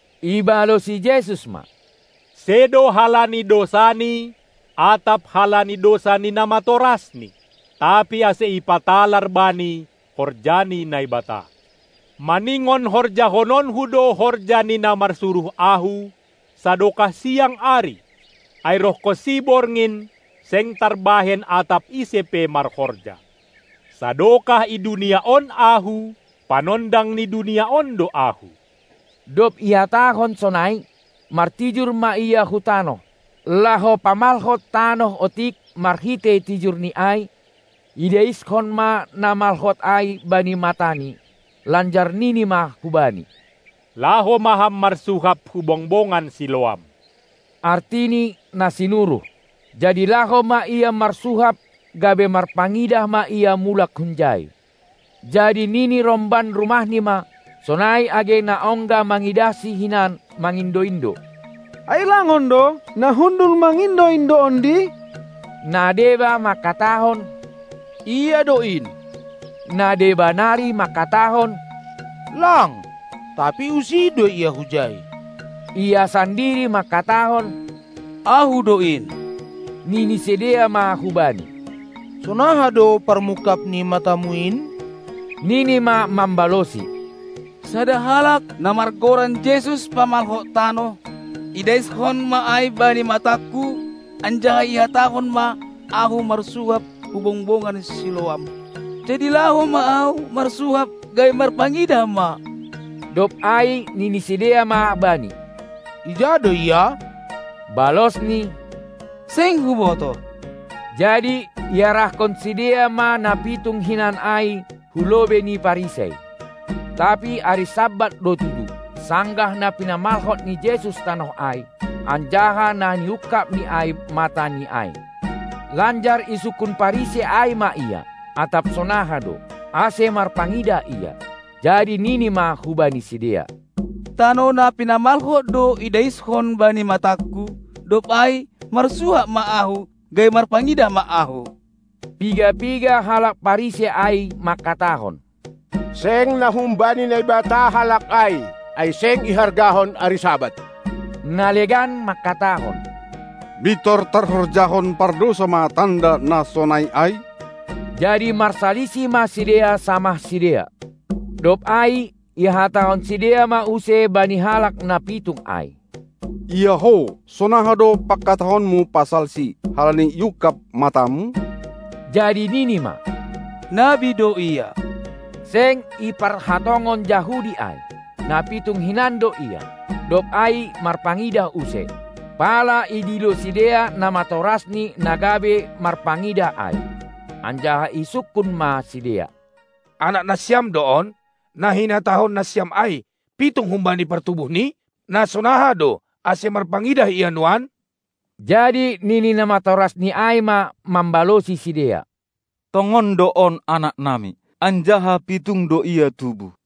Ibalosi Jesus ma: Sedo halani dousani atap halani dousa ni namatorasni, tapi ase ipatalar bani horja ni Naibata. Maningon horjahononKu do horja ni na marsuruh Ahu, sadokah siang ari; ai rohkonsi borngin, seng tarbahen atap ise pe marhorja. Sadokah i dunia on Ahu, panondang ni dunia on do Ahu. Dob ihatahon sonai, martijur ma Ia hu tanoh, laho pamalhot tanoh otik marhitei tijurNi ai, idaiskon ma na malhot ai bani matani, lanjar nini ma hubani: Laho ma ham marsuhap hu bongbongan Siloam (artini: na sinuruh). Jadi laho ma ia marsuhap, gabe marpangidah ma ia mulak hunjai. Jadi nini romban rumahni ma, sonai age na ongga mangidahsi hinan mangindo-indo: Ai lang on do, na hundul mangindo-indo ondi? Na deba mangkatahon: Ia do in! Na deba nari mangkatahon: Lang, tapi usih do ia hujai! Ia sandiri mangkatahon: Ahu do in! Nini sidea ma hubani: Sonaha do parmungkab ni matamu in? Nini ma mambalosi: Sada halak, na margoran Jesus pamalhot tanoh. Idaiskon ma ai bani matangku, anjaha ihatahon ma ahu marsuhap hu bongbongan Siloam. Jadi laho ma ahu marsuhap, gabe marpangidah ma. Dob ai nini sidea ma bani: Ija do Ia? Balosni: Seng hubotoh! Jadi iarahkon sidea ma na pitung hinan ai hu lobei ni Parisei. Tapi ari Sabat do tudu, sanggah na pinamalhot ni Jesus tanoh ai, anjaha na niungkabNi ai matani ai. Lanjar isungkun Parisei ai ma ia, atap sonaha do, ase marpangidah ia. Jadi nini ma hubani sidea: Tanoh na pinamalhot do idaiskon bani matangku, dob ai marsuhap ma ahu, gabe marpangidah ma ahu. Piga-piga halak Parisei ai mangkatahon: Seng na humbani Naibata Halak ai, ai seng ihargahon ari Sabat. Na legan mangkatahon: Mintor tarhorjahon pardousa ma tanda na sonai ai? Jadi marsalisih ma sidea samah sidea. Dob ai ihatahon sidea ma use bani halak na pitung ai: Ia ho, sonaha do pangkatahonmu pasalSi, halani iungkab matamu? Jadi nini ma: Nabi do Ia. Seng iparhatongon Jahudi ai, na pitung hinan do ia, dob ai marpangidah use, pala idilo sidea namatoras ni na gabe marpangidah ai, anjaha isungkun ma sidea: Anak nasiam do on, na hinatahon nasiam ai pitung humbani partubuhni? Na sonaha do, ase marpangidah ia nuan? Jadi nini namatorasni ai ma mambalosi sidea: Tongon do on anak nami, anjaha pitung do ia tubuh.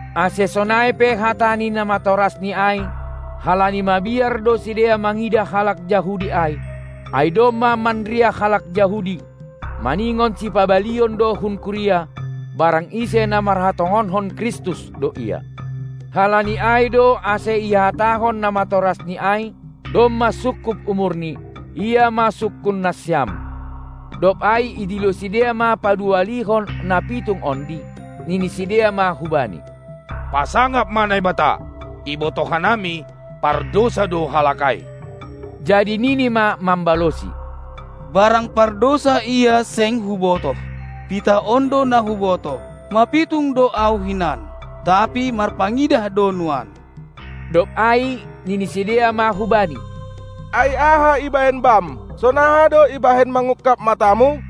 Ase sonai pe hata ni namatorasni ai, halani mabiar do sidea mangidah halak Jahudi ai. Ai domma manriah halak Jahudi, maningon sipabalion do hun kuria, barang ise na marhatongonhon Kristus do Ia. Halani ai do ase ihatahon namatorasni ai: Domma sungkup umurni, ia ma sungkun nasiam. Dob ai idilo sidea ma paduahalihon na pitung ondi, nini sidea ma hubani: Pasangap ma Naibata! Ibotoh hanami, pardousa do Halak ai! Jadi nini ma mambalosi: barang pardousa ia seng hubotoh. Pitah on do na hubotoh: Mapitung do ahu hinan, tapi marpangidah do nuan. Dob ai nini sidea ma hubani: Ai aha ibahen bam? Sonaha do ibahen mangungkab matamu?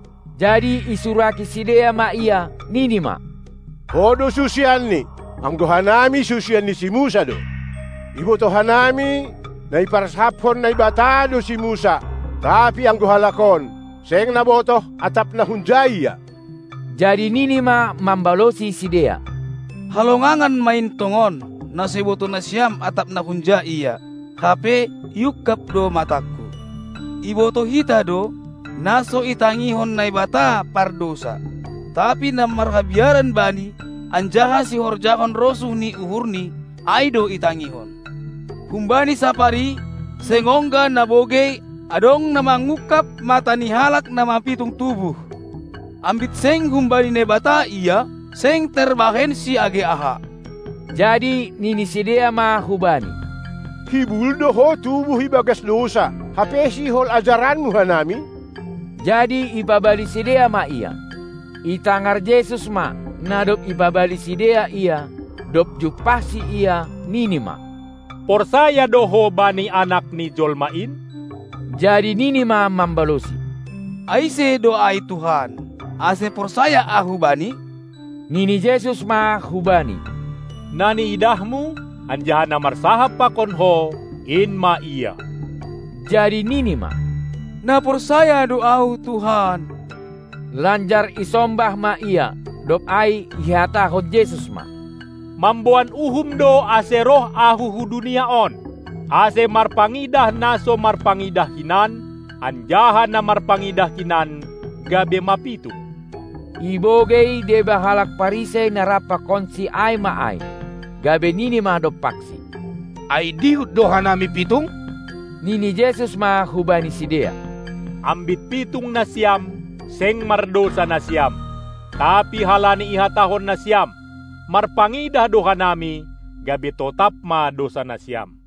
Jadi isuraki sidea ma ia, nini ma: Ho do susianNi, anggo hanami susian ni si Musa do. Ibotoh hanami, na iparsahapkon Naibata do si Musa, tapi anggo Halak on, seng nabotoh, atap na hunja Ia. Jadi nini ma mambalosi sidea: Halongangan ma in tongon na so ibotoh nasiam atap na hunja Ia, hape iungkap do matangku! Ibotoh hita do, na so itangihon Naibata pardousa, tapi na marhabiaran bani, anjaha sihorjahon rosuh ni uhurNi, ai do itangihon. Humbani sapari, seng ongga nabogei, adong na mangungkab mata ni halak na mapitung tubuh. Ambit seng humbani Naibata Ia, seng tarbahensi age aha. Jadi nini sidea ma hubani: Hibul do ho tubuh ibagas dousa, hape sihol ajaranmu hanami? Jadi ipabali sidea ma ia. Itangar Jesus ma, na dob ipabali sidea ia. Dob jumpahsi ia, nini ma: Porsaya do ho bani Anak ni jolma in? Jadi nini ma mambalosi: Ai ise do ai Tuhan, ase porsaya ahu Bani? Nini Jesus ma hubani: Na niidahmu, anjaha na marsahap pakon ho, in ma Ia. Jadi nini ma: Na porsaya do Ahu, Tuhan! Lanjar isombah ma Ia. Dob ai ihatahon Jesus ma: Mamboan uhum do, ase roh Ahu hu dunia on, ase marpangidah na so marpangidah hinan, anjaha na marpangidah hinan gabe mapitung. Ibogei deba halak Parisei na rap pakonsi ai ma ai, gabe nini ma dompaksi: Ai dihut do hanami pitung? Nini Jesus ma hubani sidea: Ambit pitung nasiam, seng mardousa nasiam. Tapi halani ihatahon nasiam: "Marpangidah do hanami," gabe totap ma dousa nasiam.